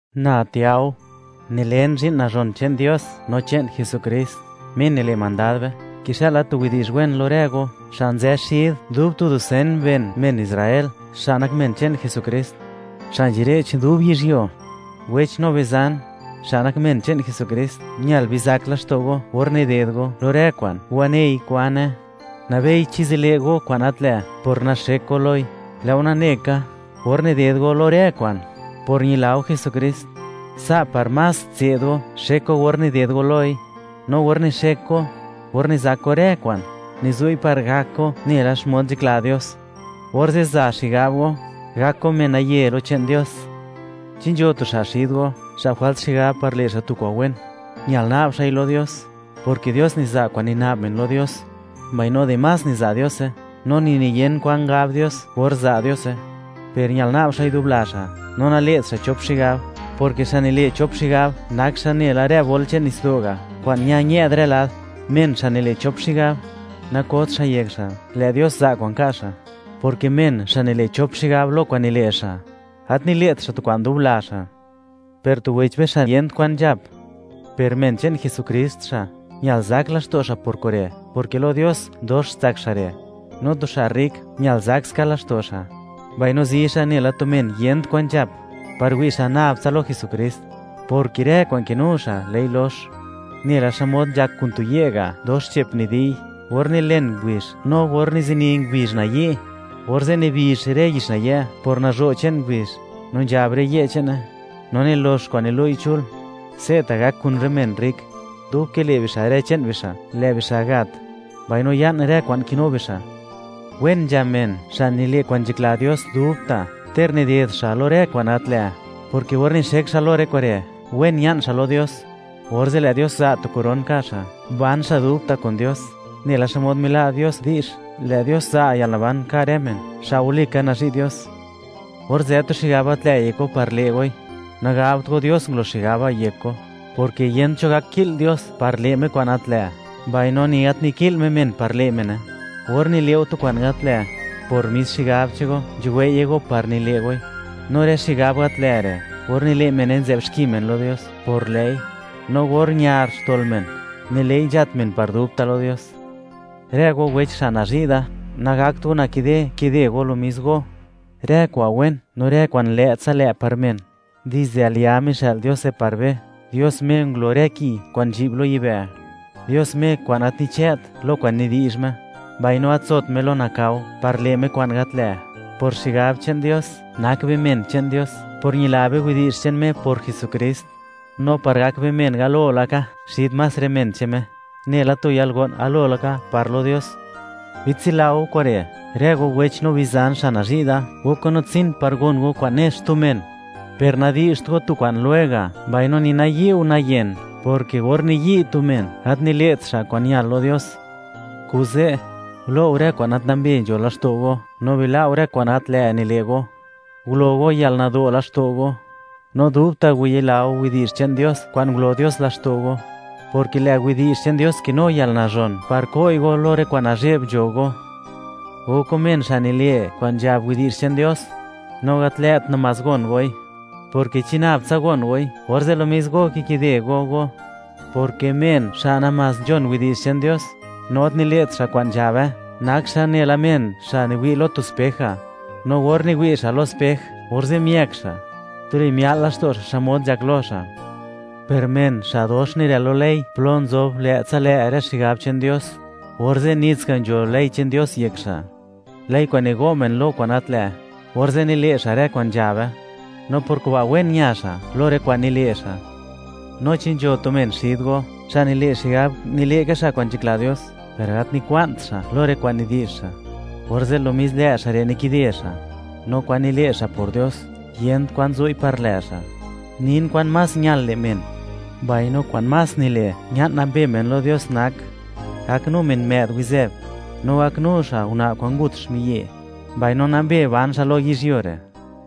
Na Tiao, nilen zhi'n nazhon che'n Dios no che'n Jesukrist, Me nile' mandad be; kixëla tu widi'zh wen lo rë go, xa' nzë xid dub tu dusen ben, men Israel, xa' nak men che'n Jesukrist xa' nzhire'ch dub yizhyuo. Wech no bizan, xa' nak men che'n Jesukrist, ñal bizak laxto' go or nided go lo rë kwa'n wanei kwane, nabei chi zile' go kwa'n gat lë' por naxek go loi. Lë' go nane ka, or nided go lo rë lo kwa'n, por ñila go Jesukrist, sa' par más tse'd go xek go or nided go loi. No or nixek go, or nizak go rë kwa'n, nizu'i par gak go nela xmod nzhakla Dios, orze' za xigab go, gak go men naye lo che'n Dios. Chi nzho tu xa' xid go, xa' jwalt xigab par le' xa' kwa'n wen, ñal na'b xa'i lo Dios, porke Dios niza' kwa'n nina'b men lo Dios, mbaino dimás niza' Diose, no ni nayen kwa'n gab Dios or za' Diose. Per ñal na'b xa'i dub la xa', no nale't xa' chop xigab, porke xa' nile' chop xigab nak xa' nela rë bol che'n nitsdo' ga', kwa'n ña-ñë'd rë lad. Men xa' nile' chop xigab, nakot xa' yek xa' lë' Dios za' kwa'n ka' xa', porke men xa' nile' chop xigab lo kwa'n nile' xa', gat nile't xa' tu kwa'n dub la xa'. Per tu wech be xa' yent kwan nzhap, per men che'n Jesukrist xa'; ñal zak laxto' xa' por kure', porke lo Dios, dox tsak xa' re'. No tu xa' rrik, ñal zak ska laxto' xa', mbaino zi xa' nela tu men yent kwan nzhap par wi' xa' nab tsa lo Jesukrist, porke rë kwa'n kinu xa', lë'i lox nela xmod nzhak kun tu ye' ga', dox che'p nidi'y. Or nilen ngubizh, no or nizini ngubizh nayi', orze' nibizh rë yix nayë' por nazho' che'n ngubizh, no nzhab rë ye' che'ne, no nilox kwa'n nilu'i chul. Se'ta' gak kun rë men rrik; dub kile' bixa' rë che'n bixa', lë' bixa' gat, mbaino ya'n rë kwa'n kinu bixa'. Wen nzha men, xa' nile' kwa'n nzhakla Dios dubta', ter nided xa' lo rë kwa'n gat lë'; porke or nixek xa' lo rë kure', wen ña'n xa' lo Dios, orze' lë' Dios za' tu koron ka' xa', ban xa' dubta' kun Dios, nela xmod mila' Dios di'zh, lë' Dios za' yalnaban ka' rë men, xa' walika nazhi' Dios. Or nzë tu xigab gat lë' yek go par le' goi, nagabt go, Dios ngulo xigab ba' yek go, porke yent cho gak ki'l Dios par le' Me kwa'n gat lë', mbaino ni gat niki'l Me men par le' mene. Or nile' go tu kwa'n gat lë', por mis xigab che'n go nzhuwei'ye go par nile' goi, no rë xigab gat lë' re', or nile' mene, nzë'b xki men lo Dios por lë'i. No or ñar xtol men, nile'i nzhat men par dubta' lo Dios. Rë go wech xa' nazhi' da, nagakt go nakide, kide go lo mis go. Rë kwa'n wen no rë kwa'n lë'tsa lë' par men, dizde al ya mixë'l Diose par be; Dios Me ngulo rë ki kwa'n nzhi'b lo yibë', Dios Me kwa'n gat nichë't lo kwa'n nidi'zh Me, mbaino gat nzot Me lo nakao par le' Me kwa'n gat lë'. Por xigab che'n Dios, nak be men che'n Dios por ñila be widi'zh che'n Me por Jesukrist, no par gak be men galo laka xid más rë men che'n Me, nela tu yalgo'n galo laka par lo Dios. Bitsila go kure', rë go wech no bizan xa' nazhi' da: Gok go natsin par gon go kwa'n ne xtu men; per nadi'zht go tu kwa'n lwega', mbaino ni nayi' go nayen, porke or niyi' tu men, gat nile't xa' kwa'n ñal lo Dios. Kuze', gulo' go rë kwa'n gat nambe nzho laxto' go, no bila' go rë kwa'n gat lë' nile' go; gulo go yalnado' laxto' go, no dubta' wayila go widi'zh che'n Dios kwa'n ngulo Dios laxto' go, porke lë' widi'zh che'n Dios kinu yalnazhon par ko'i go lo rë kwa'n nazhe'b nzho go. Gok go men xa' nile' kwa'n nzhab widi'zh che'n Dios, no gat lë't namás gon goi; porke chi nab tsa gon goi, orze' mis go kikide go go, porke men xa' namás nzhon widi'zh che'n Dios no gat nile't xa' kwa'n nzhabe, nak xa' nela men xa' niwi' lo, lo tu spej ga', no or miwi' xa' lo spej, orze' miëëk xa', tuli mia'l laxto' xa' xmod nzhak lo xa'. Per men xa' dox nirël lo ley plo nzob lë'tsa lë' rë xigab che'n Dios, orze' nits ga' nzho ley che'n Dios yek xa', ley kwa'n nigo' men lo kwa'n gat lë'; orze' nile' xa' rë kwa'n nzhabe, no por kuba' wen ña xa' lo rë kwa'n nile' xa'. No chi nzho tu men xid go, xa' nile' xigab nile' ka xa' kwa'n nzhakla Dios, per gat nikwa'n xa' lo rë kwa'n nidi'zh xa', orze' lo mis lë' xa' re' nikide xa', no kwa'n nile' xa' por Dios, yent kwa'n zu'i par lë' xa'. Nin kwan más ñal le' men, mbaino kwa'n más nile' ña'n nambe men lo Dios nak: Gaknu men më'd wizëb, no gaknu xa' una' kwa'n ngut xmiyi'; mbaino nambe ban xa' lo yizhyuo re'.